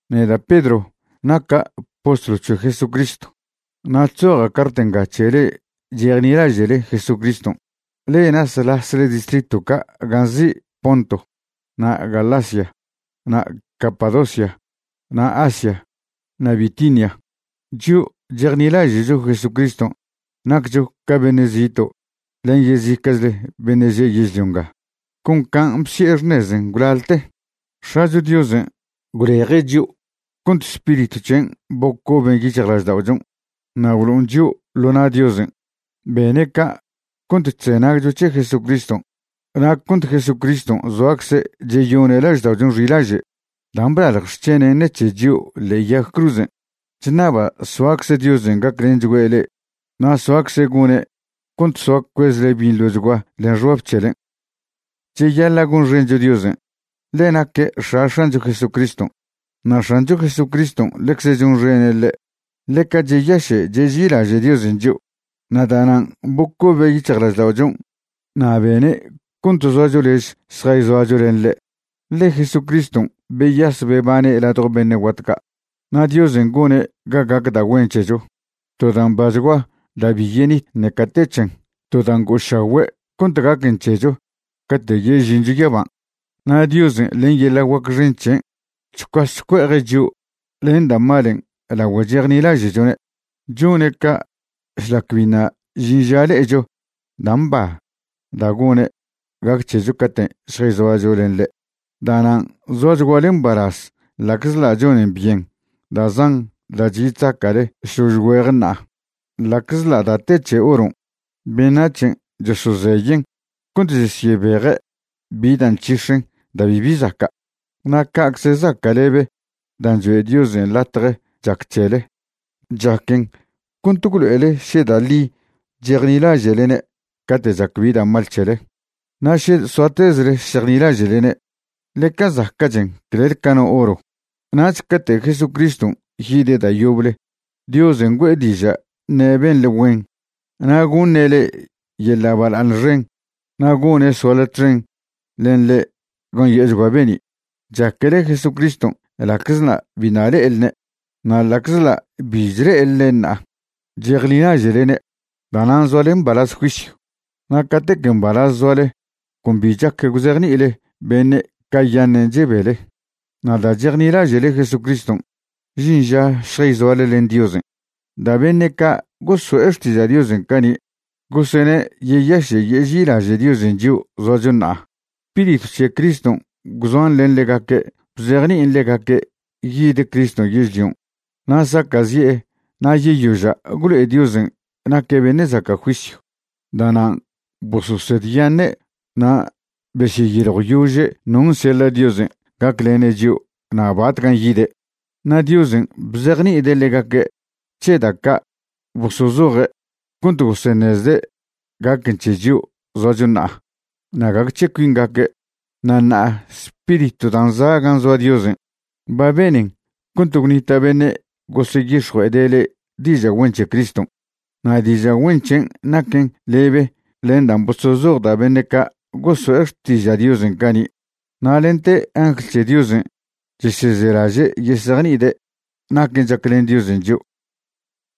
Neda' Pedro naca' postlw c̱he Jesucriston'. Na' chzoja' cart nga c̱he le'e chejnilaže'le Jesucriston', le'e nasḻasle distritw ca' gan' nzi' Ponto na' Galacia na' Capadocia na' Asia na' Bitinia. Chio' chejnilaže'cho Jesucriston' naccho ca beṉe' zito' len yezica'chle beṉe' že' yežlio nga. Con can' bsi'e xṉezen' gwlalte, X̱acho Diosen' gwleje' chio' cont Spiritw c̱hen' bocoben yic̱hjlažda'ochon' na' gwlo'on chio' ḻo na' Diosen'. Bene' ca' cont chzenagcho c̱he Jesucriston' na' cont Jesucriston' zoacze' cheyone' lažda'ochon' xilaže' dan' blalj xc̱henen' ṉec̱he chio' ḻe'e yag cruzen'. Chṉaba' soacze Diosen' gaclenchgüe' le'e na' soacze' gone' cont soa cuezle binḻochgua len xbab c̱helen'. Cheyaḻa' gonxencho Diosen'. Ḻe' naque' X̱a X̱ancho Jesucriston', na' X̱ancho Jesucriston' ḻecze chonxene' ḻe'. Ḻeca cheyaše' cheži'ilaže' Diosen' chio', na' da'nan' bocobe' yic̱hjlažda'ochon' na' bene' cont zoacho lez šjayzoacho len ḻe', ḻe Jesucriston' beyas bebane' ladjo beṉe' guat ca'. Na' Diosen' gone' ga gac da' güen c̱hecho, to da' mbachgua da' bi yenit ṉeca te c̱hen, to da' ngo'ošagüe' cont gaquen c̱hecho cate' yežincho yaban'. Na' Diosen' len yeḻa' guac xen c̱hen' chcuas chcue'eje' chio' len da' malen' lagüe chejnilaže'chone'. Chone' ca' šlac biṉa' žin ža le'echo da' mba da' gone' gac c̱hecho caten' šjayzoacho len ḻe'. Da'nan' zoachguale mbalaz ḻa'czḻa' chonen byen da' zan da' chyi chzaca'le šlož güeje ṉa'a. Ḻa'czḻa' da' te c̱he oron', beṉac̱hen' chosozeyen' cont chesyebeje' bi da' nc̱hix̱en da' bibi zaca'. Na' ca'cze zaca'lebe dan' choe' Diosen' latje chac c̱hele, chaquen cont gwlo'ele še da' ḻi chejnilaže'lene' cate' chac bi da' mal c̱hele. Na' še soatezle šejnilaže'lene', ḻeca zaca'chen clel ca no oro. Nach cate' Jesucriston' yide' da' yoble Diosen' güe'e diža' ṉe' benḻe güen na' goṉe' le'e yeḻa' bala'aṉ xen na' gone' soale txen len ḻe' gan' yo'ochgua be'ni'. Chaquele Jesucriston' ḻa'czḻa' biṉa' le'elne'. Na' ḻa'czḻa' bi chle'elne' ṉa'a, chejnilaže'lene'. Da'nan' zoale mbalaz juisyw. Na' catec mbalaz zoale con bi chac gwzejni'ile beṉe' cayaṉen' chebele. Na' da' chejnilaže'le Jesucriston', žin ža šjayzoale len Diosen'. Da' beṉe' ca' goso'e xtiža' Diosen' cani' gosene' yeyaše' yeži'ilaže' Diosen' chio' zoacho ṉa'a. Spiritw c̱he Criston' gwzoan len ḻegaque' bzejni'in ḻegaque' yid Criston' yežlion' na' saca'zi'e na' yeyoža' gwlo'e Diosen' naque' beṉe' zaca' juisyw. Da'nan' bososedyaṉe' na' besyeyiljwyože' non' seḻa' Diosen' gaclene' chio' na' batcan' yide'. Na' Diosen' bzejni'ide' ḻegaque' c̱he da' ca' bosozoje' cont goseṉezde' gaquen c̱he chio' zoacho ṉa'a na' gague c̱he cuingaque'. Na' ṉa'a Spiriton' dan' za' gan' zoa Diosen' ba benen cont gwnita' beṉe' goseyix̱jue'ede' le'e diža' güen c̱he Criston', na' diža' güen c̱hen' naquen lebe len dan' bosozoj da' beṉe' ca' goso'e xtiža' Diosen' cani'. Na' lente angl c̱he Diosen' chesezelaže' yesejni'ide' naquen' chaclen Diosen' chio'.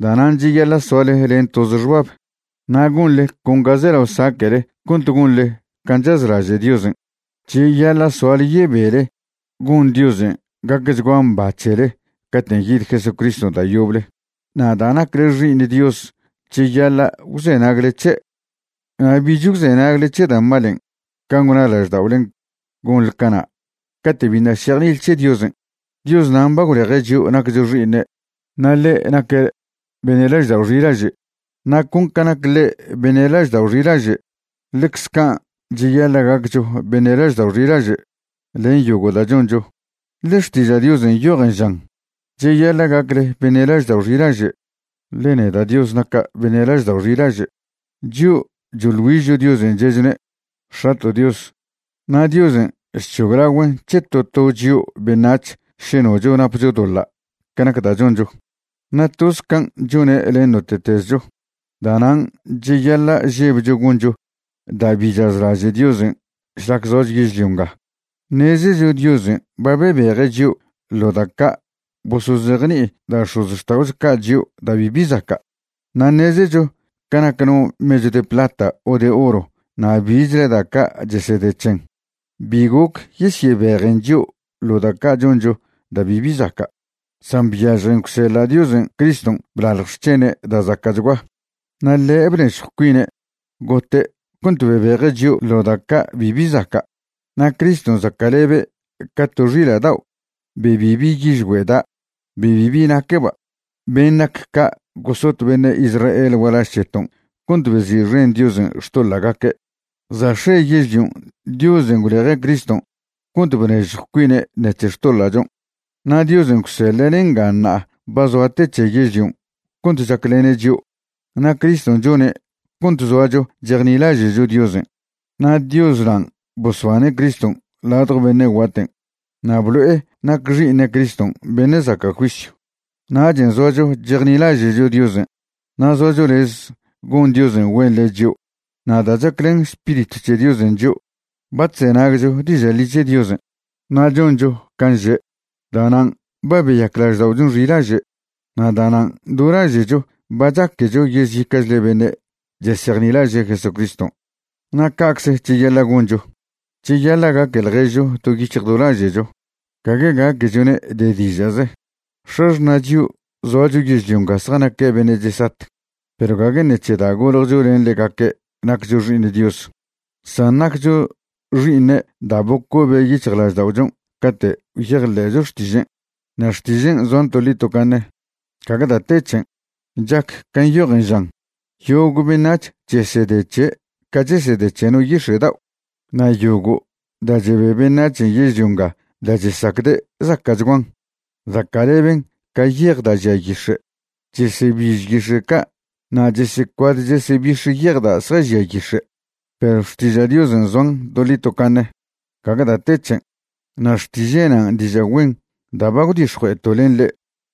Da'nan' cheyaḻa' soale len toze xbab na' gonḻe con ga zelao saque'le cont gonḻe can' chazlaže' Diosen'. Cheyaḻa' soale yebele gon Diosen' gacchgua mba c̱hele caten' yid Jesucriston' da' yoble. Na' da' nacle xi'iṉ Dios cheyaḻa' gwzenagle c̱he', na' bich gwzenagle c̱he da' malen' can' gwna lažda'olen' gonḻe cana' cate' biṉa' šejni'ile c̱he Diosen'. Dios nan' ba gwleje' chio' naccho xi'iṉe', na' ḻe' naque' beṉe' laždao' xilaže'. Na' con ca nac ḻe' beṉe' laždao' xilaže', ḻecze can' cheyaḻa' gaccho beṉe' laždao' xilaže' len yogo' da' choncho. Ḻe Xtiža' Diosen' nyojen žan: “Cheyaḻa' gacle beṉe' laždao' xilaže', ḻe neda' Dios naca' beṉe' laždao' xilaže'.” Chio' choḻ güižcho Diosen' che'chone': “X̱ato' Dios”. Na' Diosen' chc̱hoglagüen' c̱he to to chio' beṉac̱h še nocho napcho doḻa' ca nac da' choncho, na' toz can' chone' len note'tezcho. Da'nan' cheyaḻa' žebcho goncho da' bi chazlaže' Diosen' šlac zoacho yežlio nga. Ṉezecho Diosen' ba bebeje' chio' ḻo da' ca' bosozejni'i da' x̱ozxta'ocho ca' chio' da' bibi zaca'. Na' ṉezecho ca nac no mechw de plata o de oro na' bichle da' ca' chesede c̱hen, bi goc yesyebejen chio' ḻo da' ca' choncho da' bibi zaca'. San byažjen gwseḻa' Diosen' Criston' blalj xc̱hene' da' zaca'chgua. Na' ḻe' bnežjw cuine' gote' cont bebeje' chio' ḻo da' ca' bibi zaca'. Na' Criston' zaca'lebe' ca to xila' dao' be bibi yižgüe' da', be bibi naqueba'. Ben' nac ca' gosot beṉe' Israel gualaž c̱heton' cont bezi'xen Diosen' xtoḻa'gaque'. Za' x̱e yežlion' Diosen' gwleje' Criston' cont bnežjw cuine' ṉec̱he xtoḻa'chon'. Na' Diosen' gwseḻe'ne' nga ṉa'a ba zoa te c̱he yežlion' cont chaclene' chio'. Na' Criston' chone' cont zoacho chejnilaže'cho Diosen'. Na' Dios nan' bosbane' Criston' ladjo beṉe' guaten' na' blo'e nac Xi'iṉe' Criston' beṉe' zaca' juisyw. Nachen' zoacho chejnilaže'cho Diosen' na' zoacho lez gon Diosen' güen len chio'. Na' da' chaclen Spiritw c̱he Diosen' chio', ba chzenagcho diža' ḻi c̱he Diosen' na' choncho can' že'. Da'nan' ba beyac lažda'ochon' xilaže', na' da'nan' do laže'cho ba chaquecho yezica'chle beṉe' chesejnilaže' Jesucriston'. Na' ca'cze cheyaḻa' goncho, cheyaḻa' gaque ḻježcho do yic̱hj do laže'cho, gague gaquechone' de diža'ze. X̱axṉa' chio' zoacho yežlio nga zjanaque' beṉe' chesat, perw gague ṉeche da' goljcho len ḻegaque' naccho xi'iṉ Dios, san naccho xi'iṉe' da' bocobe' yic̱hjlažda'ochon' cate' gwyejḻe'cho xtižen'. Na' xtižen' zoan toḻi tocaṉe, gague da' te c̱hen. Chac can' nyojen, žan: Yogo' beṉac̱h chesede c̱he' ca chesede c̱he no yix̱e' dao', na' yogo' da' chebe beṉachen' yežlio nga da' chesacde' zaca'chguan, zaca'leben ca yej da' žia yix̱e'. Chesebiž yix̱e' ca' na' chesecuad chesebix̱ yej da' zjažia yix̱e'. Perw xtiža' Diosen' zoan toḻi tocaṉe, gague da' te c̱hen. Na' xtiže' nan' diža' güen da' ba gwdix̱jue'eto' len le'e.